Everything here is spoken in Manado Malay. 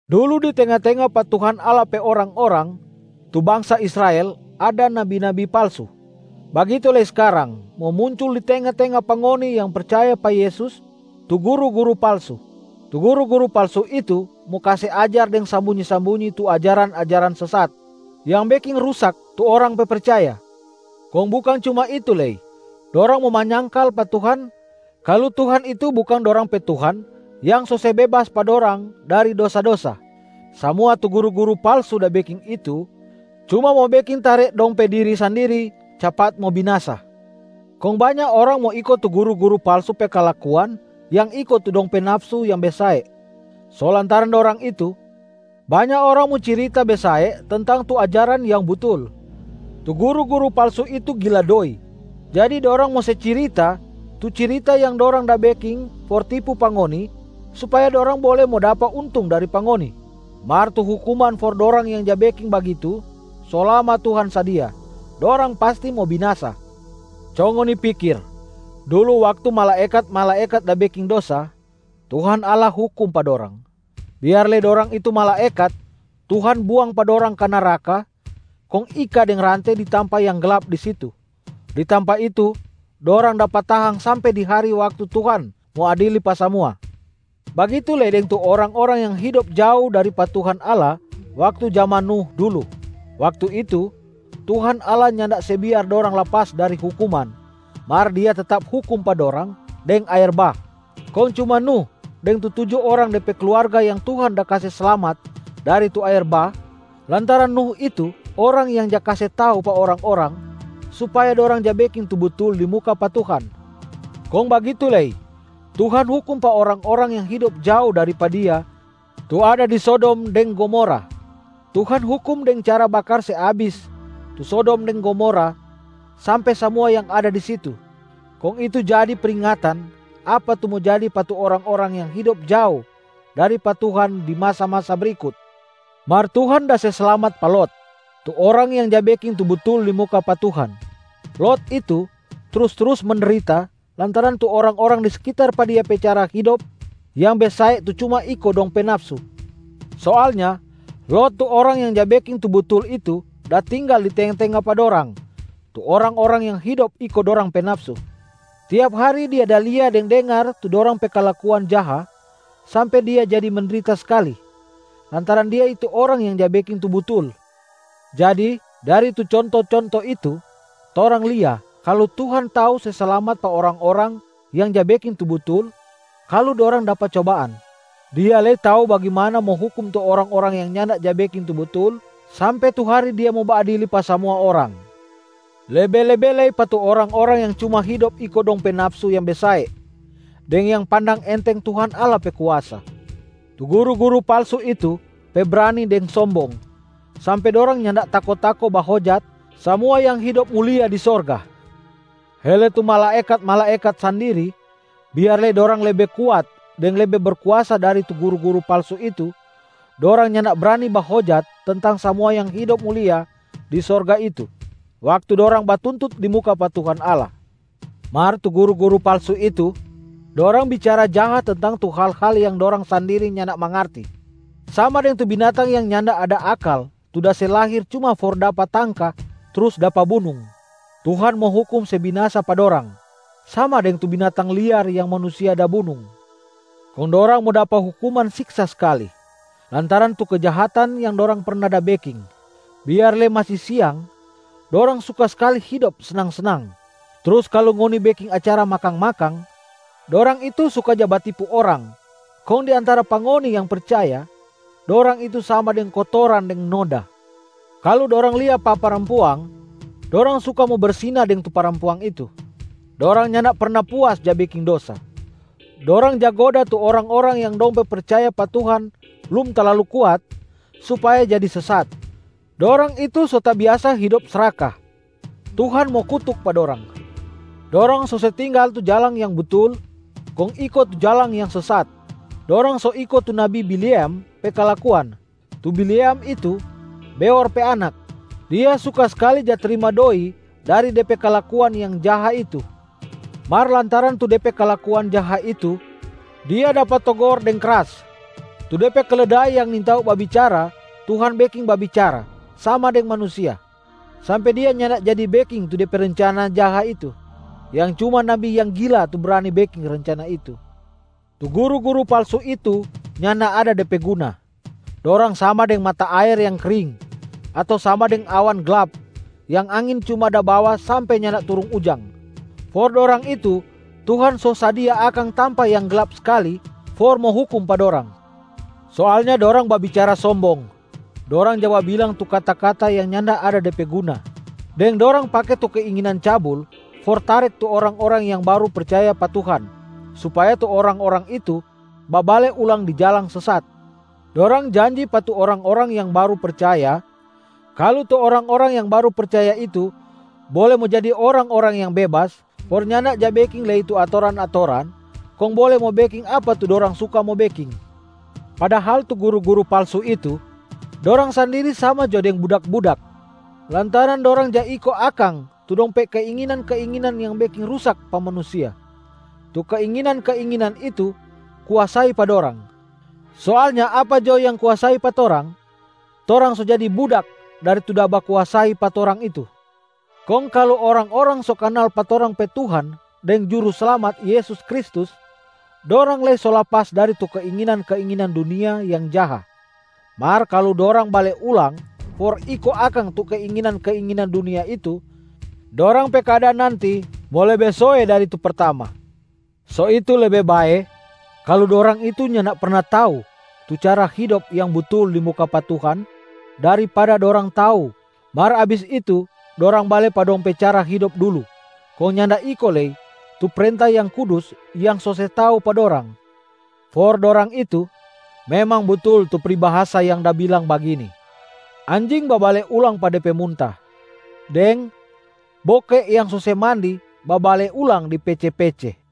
Dulu di tenga-tenga pa Tuhan Allah pe orang-orang tu bangsa Israel ada nabi-nabi palsu, bagitu lei skarang mo muncul di tenga-tenga pa ngoni yang percaya pa Yesus tu guru-guru palsu. Tu guru-guru palsu itu mo kase ajar deng sambunyi-sambunyi tu ajaran-ajaran sesat yang beking rusak tu orang pe percaya. Kong bukang cuma itu lei, dorang mo manyangkal pa Tuhan kalu Tuhan itu bukang dorang pe Tuhan yang so se bebas pa dorang dari dosa-dosa. Samua tu guru-guru palsu da beking itu, cuma mo beking tare dong pe diri sandiri capat mo binasa. Kong banya orang mo iko tu guru-guru palsu pe kalakuan yang iko tu dong pe nafsu yang besae. So lantaran dorang itu, banya orang mo cirita besae tentang tu ajaran yang butul. Tu guru-guru palsu itu gila doi, jadi dorang mo se cirita tu cirita yang dorang da beking for tipu pa ngoni supaya dorang bole mo dapa untung dari pa ngoni. Mar tu hukuman for dorang yang ja beking bagitu so lama Tuhan sadia, dorang pasti mo binasa. Co ngoni pikir, dulu waktu malaekat-malaekat da beking dosa, Tuhan Allah hukum pa dorang, biar lei dorang itu malaekat. Tuhan buang pa dorang ka neraka kong ika deng rante di tampa yang glap di situ. Di tampa itu dorang dapa tahang sampe di hari waktu Tuhan mo adili pa samua. Bagitu lei deng tu orang-orang yang hidop jao dari pa Tuhan Allah waktu jaman Nuh dulu. Waktu itu, Tuhan Allah nyanda se biar dorang lapas dari hukuman mar Dia tetap hukum pa dorang deng aer bah. Kong cuma Nuh deng tu tuju orang de pe kluarga yang Tuhan da kase slamat dari tu aer bah lantaran Nuh itu orang yang ja kase tau pa orang-orang supaya dorang ja beking tu butul di muka pa Tuhan. Kong bagitu lei Tuhan hukum pa orang-orang yang hidop jao dari pa Dia tu ada di Sodom deng Gomora. Tuhan hukum deng cara bakar se abis tu Sodom deng Gomora sampe samua yang da di situ. Kong itu jadi pringatan apa tu mo jadi pa tu orang-orang yang hidop jao dari pa Tuhan di masa-masa brikut. Mar Tuhan da se slamat pa Lot, tu orang yang ja beking tu butul di muka pa Tuhan. Lot itu trus-trus mendrita lantaran tu orang-orang di sekitar pa dia pe cara hidop yang besae tu cuma iko dong pe nafsu. Soalnya, Lot tu orang yang ja beking tu butul itu da tinggal di tenga-tenga pa dorang tu orang-orang yang hidop iko dorang pe nafsu. Tiap hari dia da lia deng da dengar tu dorang pe kalakuan jaha sampe dia jadi mendrita skali lantaran dia itu orang yang ja beking tu butul. Jadi dari tu conto-conto itu, torang lia kalu Tuhan tau se slamat pa orang-orang yang ja beking tu butul kalu dorang dapa cobaan. Dia lei tau bagimana mo hukum tu orang-orang yang nyanda ja beking tu butul sampe tu hari Dia mo baadili pa samua orang, lebe-lebe lei pa tu orang-orang yang cuma hidop iko dong pe nafsu yang besae deng yang pandang enteng Tuhan Allah pe kuasa. Tu guru-guru palsu itu pe brani deng sombong sampe dorang nyanda tako-tako bahojat samua yang hidop mulia di sorga. Hele tu malaekat-malaekat sandiri, biar lei dorang lebe kuat deng lebe berkuasa dari tu guru-guru palsu itu, dorang nyanda brani bahojat tentang samua yang hidop mulia di sorga itu waktu dorang batuntut di muka pa Tuhan Allah. Mar tu guru-guru palsu itu, dorang bicara jaha tentang tu hal-hal yang dorang sandiri nyanda mangarti, sama deng tu binatang yang nyanda ada akal tu da se lahir cuma for mo dapa tangka trus dapa bunung. Tuhan mo hukum se binasa pa dorang, sama deng tu binatang liar yang manusia da bunung. Kong dorang mo dapa hukuman siksa skali lantaran tu kejahatan yang dorang perna da beking. Biar lei masi siang, dorang suka skali hidop snang-snang. Trus kalu ngoni beking acara makang-makang, dorang itu suka ja batipu orang kong di antara pa ngoni yang percaya, dorang itu sama deng kotoran deng noda. Kalu dorang lia pa parampuang, dorang suka mo bersina deng tu parampuang itu. Dorang nyanda perna puas ja beking dosa. Dorang ja goda tu orang-orang yang dong pe percaya pa Tuhan blum talalu kuat supaya jadi sesat. Dorang itu so tabiasa hidop sraka. Tuhan mo kutuk pa dorang. Dorang so se tinggal tu jalang yang butul kong iko tu jalang yang sesat. Dorang so iko tu nabi Bileam pe kalakuan. Tu Bileam itu Beor pe anak. Dia suka skali ja trima doi dari de pe kalakuan yang jaha itu. Mar lantaran tu de pe kalakuan jaha itu, dia dapa togor deng kras. Tu de pe keledai yang nintau babicara Tuhan beking babicara sama deng manusia, sampe dia nyanda jadi beking tu de pe rencana jaha itu, yang cuma nabi yang gila tu brani beking rencana itu. Tu guru-guru palsu itu nyanda ada de pe guna, dorang sama deng mata aer yang kring ato sama deng awan glap yang angin cuma da bawa sampe nyanda turung ujang. For dorang itu Tuhan so sadia akang tampa yang glap skali for mo hukum pa dorang. Soalnya dorang babicara sombong, dorang ja babilang tu kata-kata yang nyanda ada de pe guna, deng dorang pake tu keinginan cabul for tarek tu orang-orang yang baru percaya pa Tuhan supaya tu orang-orang itu babale ulang di jalang sesat. Dorang janji pa tu orang-orang yang baru percaya kalu tu orang-orang yang baru percaya itu bole mo jadi orang-orang yang bebas for nyanda ja beking lei tu atoran-atoran kong bole mo beking apa tu dorang suka mo beking. Padahal tu guru-guru palsu itu, dorang sandiri sama jo deng budak-budak lantaran dorang ja iko akang tu dong pe keinginan-keinginan yang beking rusak pa manusia, tu keinginan-keinginan itu kuasai pa dorang. Soalnya apa jo yang kuasai pa torang, torang so jadi budak dari tu da bakuasai pa torang itu. Kong kalu orang-orang so kanal pa torang pe Tuhan deng Juruslamat Yesus Kristus, dorang lei so lapas dari tu keinginan-keinginan dunia yang jaha. Mar kalu dorang bale ulang for iko akang tu keinginan-keinginan dunia itu, dorang pe keadaan nanti mo lebe soe dari tu pertama. So itu lebe bae kalu dorang itu nyanda perna tau tu cara hidop yang butul di muka pa Tuhan daripada dorang tau mar abis itu dorang bale pa dong pe cara hidop dulu kong nyanda iko lei tu prenta yang kudus yang so se tau pa dorang. For dorang itu, memang butul tu pribahasa yang da bilang bagini: “Anjing babale ulang pa de pe munta” deng “boke yang so se mandi babale ulang di pece-pece.”